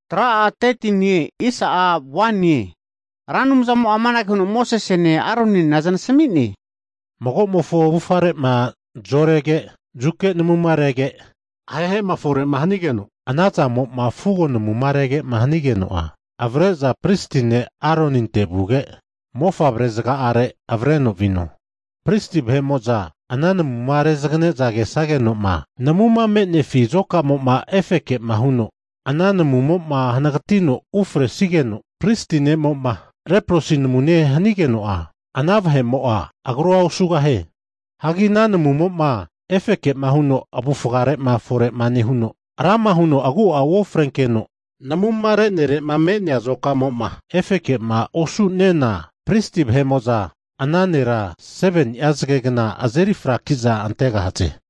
Ra Anumzamo'a amanage huno Mosesene Aroninena zanasami'ne, Mago'mofo avufare'ma zorege, zuke namurege, ahehema fore'ma hanigeno, anazamo'ma fugo namuma rege'ma hanige'za avre'za pristi ne' Aroninte vuge, mofavre zaga'are avre'za viho. Hagi Pristi vahe'mo'za ana namuna rezagane'za kesageno'ma, namuma me'nenifima azokamo'ma efeke'ma huno ana namumo'ma hanagatino ufre'nesigeno, pristi ne'mo'ma reprosi namune hanigeno'a, ana vahe'mo'a agru osugahie. Hagi ana namumo'ma efeke huno avufgare'ma fore'ma nehuno, rama huno agu'a uofrenkeno namuma re'nere'ma me'nea azokamo'ma efeke'ma osu'nena pristi vahe'mo'za ana nera 7ni'a zagegna azeri frakiza antegahaze.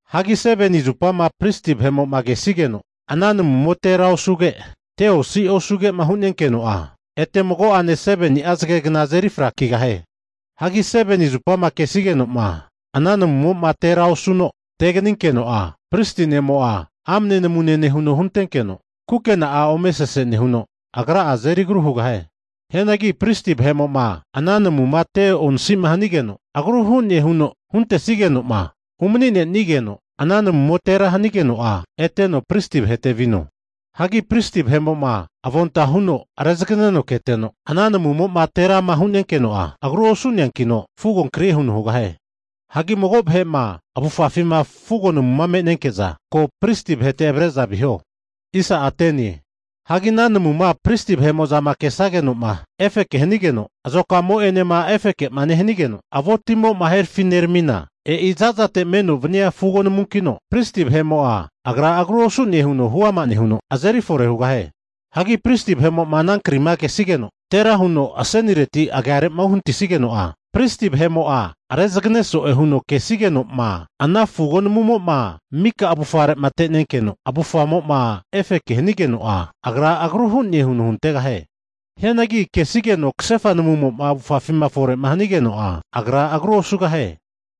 Hagi 7ni zupama pristi vahe'mo'ma kesigeno ana namumo tera osuge, te osi osugema hu'nenkeno'a, ete mago'ane 7ni'a zagegna azeri frakigahie. Hagi 7ni zupama kesigeno'ma ana namumo'ma tera osuno teganinkeno'a, pristi ne'mo'a amne namune nehuno huntenkeno, kukena'a ome sese nehuno, agra'a azeri agru hugahie. Hianagi pristi vahe'mo'ma ana namuma te onasima hanigeno agru hune huno huntesige'noma umani'nenigeno, ana namumo tera hanigeno'a eteno pristi vahete vino. Hagi pristi vahe'mo'ma avonta huno rezaganeno keteno, ana namumo'ma terama hu'nenkeno'a, agru osu'neankino fugo krie huno hugahie. Hagi mago vahe'ma avufafima fugo namuma me'nenke'za, ko pristi vahete avre'za viho. Hagi ana namuma pristi vahe'mo'za kesagenoma efeke hanigeno, azokamo'enema efeke'ma nehanigeno, avo timo'ma herafineramina, e'i zazate meno vania fugo namunkino, pristi vahe'mo'a agra agru osune huno huama nehuno azeri fore hugahie. Hagi pristi vahe'mo ana fugo ri'ma kesigeno tera huno asenireti agiare'ma uhanatisigeno'a, pristi vahe'mo'a rezagane so'e huno kesigenoma ana fugo namumo'ma mika avufare'ma tenenkeno, avufamo'ma efeke hanigeno'a, agra agru hu'ne huno huntegahie. Hianagi kesigeno kasefa namuma avufafima fore'ma hanigeno'a, agra agru osugahie.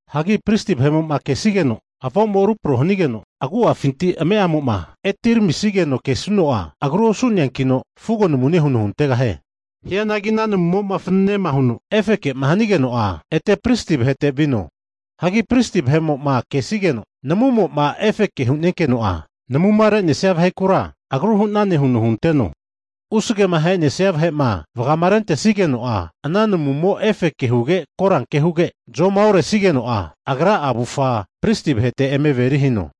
Hagi pristi vahe'mo'ma kesigeno avo'mo rupro hanigeno, agu'afinti ame'amo'ma etiramisigeno kesuno'a, agru osu'neankino fugo namune huno huntegahie. Hianagi ana namumo'ma fananema huno efeke'ma hanigeno'a, ete pristi vahete vino. Hagi pristi vahe'mo'a kesigeno'ma, namumo'ma efeke hu'nenkeno'a, namuma re'nesia vahekura agru hu'nane huno hunteno. Usagema ahenesia vahe'ma vagamarentesigeno'a, ana namumo efeke huge koranke huge, zomaoresigeno'a, agra'a avufa pristi vahete eme averi hino.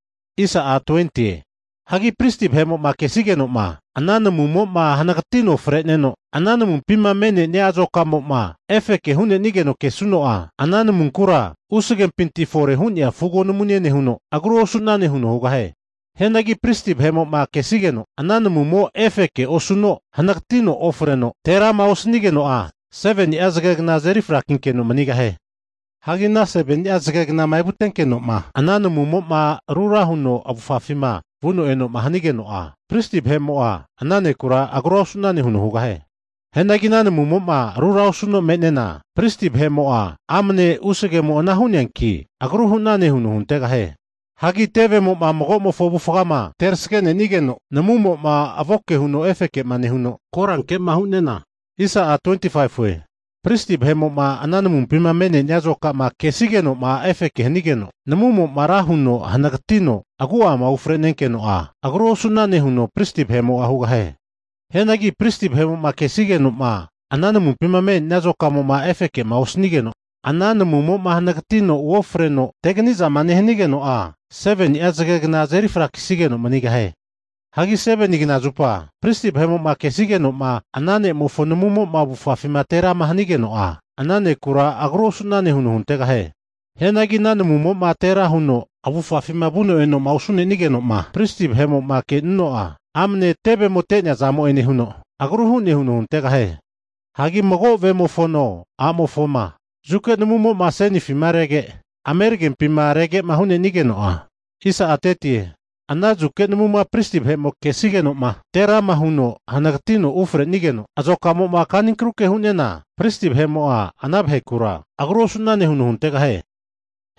Hagi pristi vahe'mo'ma kesageno'ma ana namumo hanagatino fre'neno, ana namumpima me'nenia azokamo'ma efeke hu'nenigeno kesuno'a, ana namunkura usagempinti fore hu'nea fugo namune nehuno, agru osu'nane huno hugahie. Hianagi pristi vahe'mo'ma kesigeno, ana namumo efeke osuno hanagatino ofreno terama osanigeno'a, 7ni'a zagegna azeri frakinkeno manigahie. Hagi ana 7ni'a knama evutenkeno'ma ana namumo'ma rura huno avufafima vuno enoma hanigeno'a, pristi vahe'mo'a ana nekura agru osu'nane huno hugahie. Hianagi ana namumo rura osuno me'nena, pristi vahe'mo'a amane usagemo ana hu'neanki agru hu'nane huno huntegahie. Hagi tevemo'ma mago'mofo avufgama terasgene'nigeno, namumo'ma avoke huno efeke'ma nehuno koranke'ma hu'nena, pristi vahe'mo'ma ana namumpima me'nenia azokama kesigeno'ma efeke hanigeno, namumo'ma ra huno hanagatino agu'ama ufre'nenkeno'a, agrua osu'nane huno pristi vahe'mo'a hugahie. Hianagi pristi vahe'mo'ma kesigeno'ma, ana namumpima me'nenia azokamo'ma efeke'ma osanigeno, ana namumo'ma hanagatino uofreno, teganizama nehanigeno'a, 7ni'a zagegna azeri frakisigeno manigahie. Hagi 7ni kna zupa pristi vahe'mo'ma kesigeno'ma ana ne'mofo namumo'ma avufafima terama hanigeno'a, ana nekura agru osu'nane huno huntegahie. Hianagi ana namumo'ma tera huno avufafima vuno enoma osanigeno'ma, pristi vahe'mo'ma kenuno'a, amane tevemo te'neazamo'e nehuno, agru hu'ne huno huntegahie. Hagi mago vemofono a'mofoma, zuke namuma asenifi rege, ameragempima rege'ma hu'nenigeno'a, ana zuke namuma pristi vahe'mo kesigeno'ma terama huno hanagatino ufrenigeno, azokamo'ma kaninkruke hu'nena pristi vahe'mo'a ana vahekura, agru osu'nane huno huntegahie.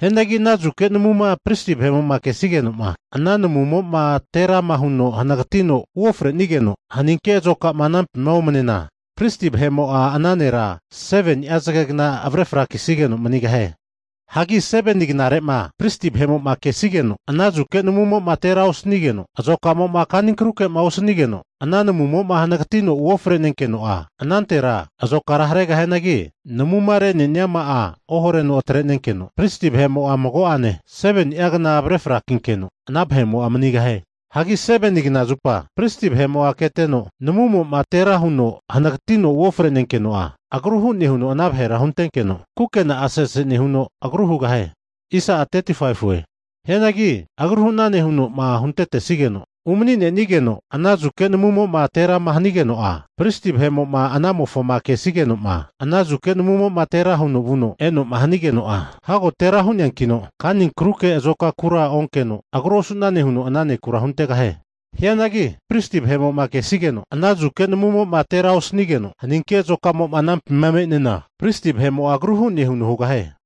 Hianagi ana zuke namuma pristi vahe'mo'ma kesigeno'ma ana namumo'ma terama huno hanagatino uofrenigeno, haninke azokama anampima omanena, pristi vahe'mo'a ana nera 7ni'a zagegna avre frakisigeno manigahie. Hagi 7ni knare'ma pristi vahe'mo'ma kesigeno ana zuke namumo'ma tera osanigeno, azokamo'ma kaninkruke'ma osanigeno, ana namumo hanagatino uofre'nenkeno'a, anantera azokara haregahianagi, namuma re'neniama'a ohareno atrenenkeno, pristi vahe'mo'a mago'ane 7ni'a kna avre frakinkeno ana vahe'mo'a manigahie. Hagi 7ni kna zupa pristi vahe'mo'a keteno, namumo'ma terama huno hanagatino'ma uofre'nenkeno'a, agru hu'ne huno ana vahera huntenkeno, kukena'a sese nehuno agru hugahie. Hianagi agru hu'nane huno'ma huntetesigeno, umani'nenigeno ana zuke namumo'ma terama hanigeno'a, pristi vahe'mo'ma anamofoma kesigeno'ma, ana zuka namumo'ma tera huno vuno enoma hanigeno, hago tera hu'neankino pristi ne'mo'a kanikruke azokakura onkeno, agru osu'nane huno ana ne'kura huntegahie. Hianagi pristi vahe'mo'ma kesigeno ana zuke namumo'ma tera osanigeno, haninke azokama anampima me'nena pristi vahe'mo'a agru hu'ne huno hugahie.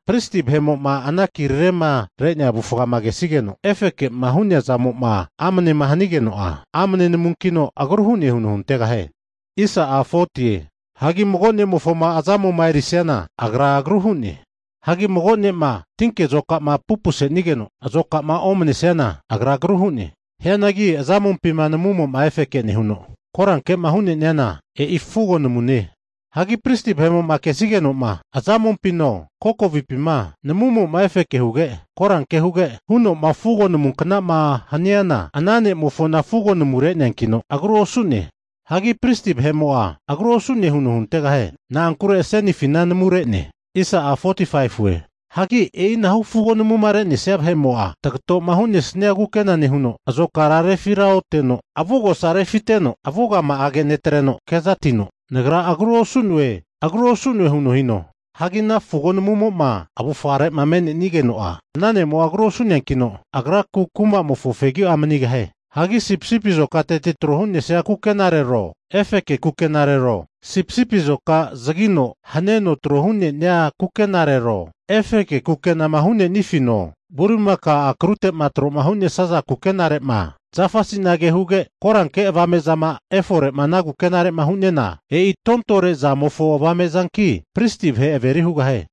pristi vahe'mo'ma ana kirarema re'nea avufafima kesigeno efekema hu'nea zamo'ma amanema hanigeno'a, amne namunkino, agru hu'ne huno huntaghie. Hagi mago ne'mofoma anumpi azamoma erisiana, agra agru hu'ne. Hagi mago ne'ma tinke azokama pupusenigeno azokamo'ma omanesiana, agra agru hu'ne. Hianagi azamompima namumo'ma efeke nehuno koranke'ma hu'neniana, e'i fugo namune. Hagi pristi vahe'mo'ma kesigeno'ma azamompino, kokovipima namumo'ma efeke huge, koranke huge huno'ma fugo namunknama haniana, ana ne'mofona fugo namu re'neankino, agru osu'ne. Hagi pristi vahe'mo'a agru osu'ne huno huntegahie. Na'ankure asenifina namu re'ne. Hagi e'inahu fugo namuma re'nesia vahe'mo'a, tagato'ma hu'nesnia kukena nehuno, azokara refiraoteno, avugosa refiteno avugama'age netreno kezatino, nagra agru osu'noe nagra agru osu'noe huno hino. Hagi ana fugo namuma avufare'ma me'nenigeno'a ana ne'mo'a agru osu'neakino, agraku kumamofo fegi'a manigahie. Hagi sipisipi azokateti tro hu'nesia kukenarero, efeke kukenarero, sipisipi azoka zagino haneno tro hu'nenia kukenarero, efeke kukenama hanenifino, bulimakao akrutema tro'ma hu'nesaza kukenare'ma, zafa sinage huge koranke avame'zama efore'ma ana kukenare'ma hu'nena, e'i tontore zamofo avame'zanki, pristi vahe averi hugahie.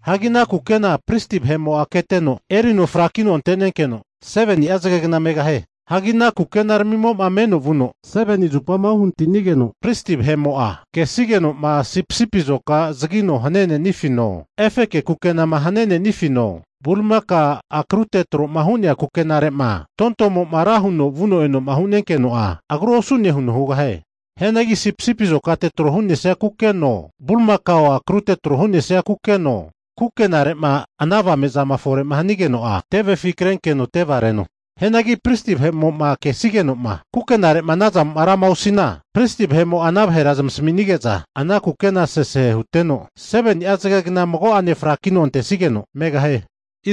Hagi ana kukena pristi vahe'mo'a keteno, erino frakino ante'nenkeno 7ni'a zagegna megahie. Hagi ana kukenaramimo'ma meno vuno 7ni zupama uhanatinigeno pristi vahe'mo'ma kesigeno'ma sipisipi azoka zagino hanenenifino, efeke kukenama hanenenifino, bulimakao akrutema tro'ma hu'nea kukenare'ma tontomo'ma ra huno vuno eno'ma hu'nenkeno'a, agru osu'ne huno hugahie. Hianagi sipisipi azokate tro hu'nesia kukeno, bulimakao akrute tro hu'nesia kukeno, kukenare'ma ana avame'zama fore'ma hanigeno'a, tevefi krenkeno tevareno. Hianagi pristi vahe'mo'ma kesigeno kukenare'ma anazamo'ma rama osu'nena, pristi vahe'mo'a ana vahera zamasaminige'za ana kukena sese hute'za, 7ni'a zagegna mago'ane fraki'za antesageno megahie.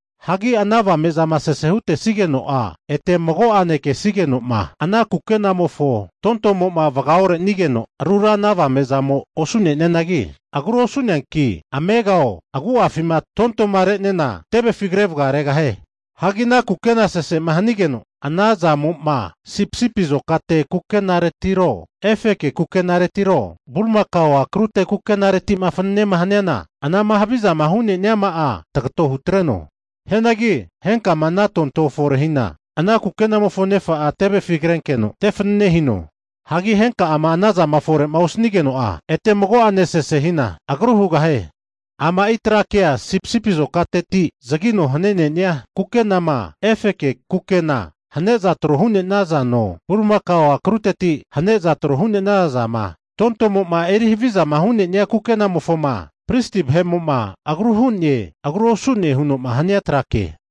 Hagi ana avame'zama sesema hutesageno'a ete mago'ane kesigenoma ana kukenamofo tontomo'ma vaga'orenigeno rura ana avamezamo osu'nenianagi, agru osu'neanki amegao agu'afima tontoma re'nena tevefi kre vagaregahie. Hagi ana kukena sese'ma hanigeno, ana zamo'ma sipisipi azokate kukenaretiro, efeke kukenaretiro, bulimakao akrute kukenaretima fananema haniana, anama havizama hu'nema'a tagato hutreno. Hagi henkama ana tonto fore'ma hina, ana kukenamofo nefa'a tevefi krenkeno, te fanane hino. Hagi henka'ama anazama fore'ma osanigeno'a, ete mago'ane sese hina agrua hugahie. Ama'i tra kea sipisipi azokateti zagino hane'ne'nia kukenama, efeke kukena hane'za tro hu'ne'nazano, bulimakao akruteti hane'za tro hu'nenaza zama tontomo'ma eri havizama hu'nenia kukenamofoma pristi vahe'mo'ma agru hu'ne, agru osu'nema huno'ma hania trake.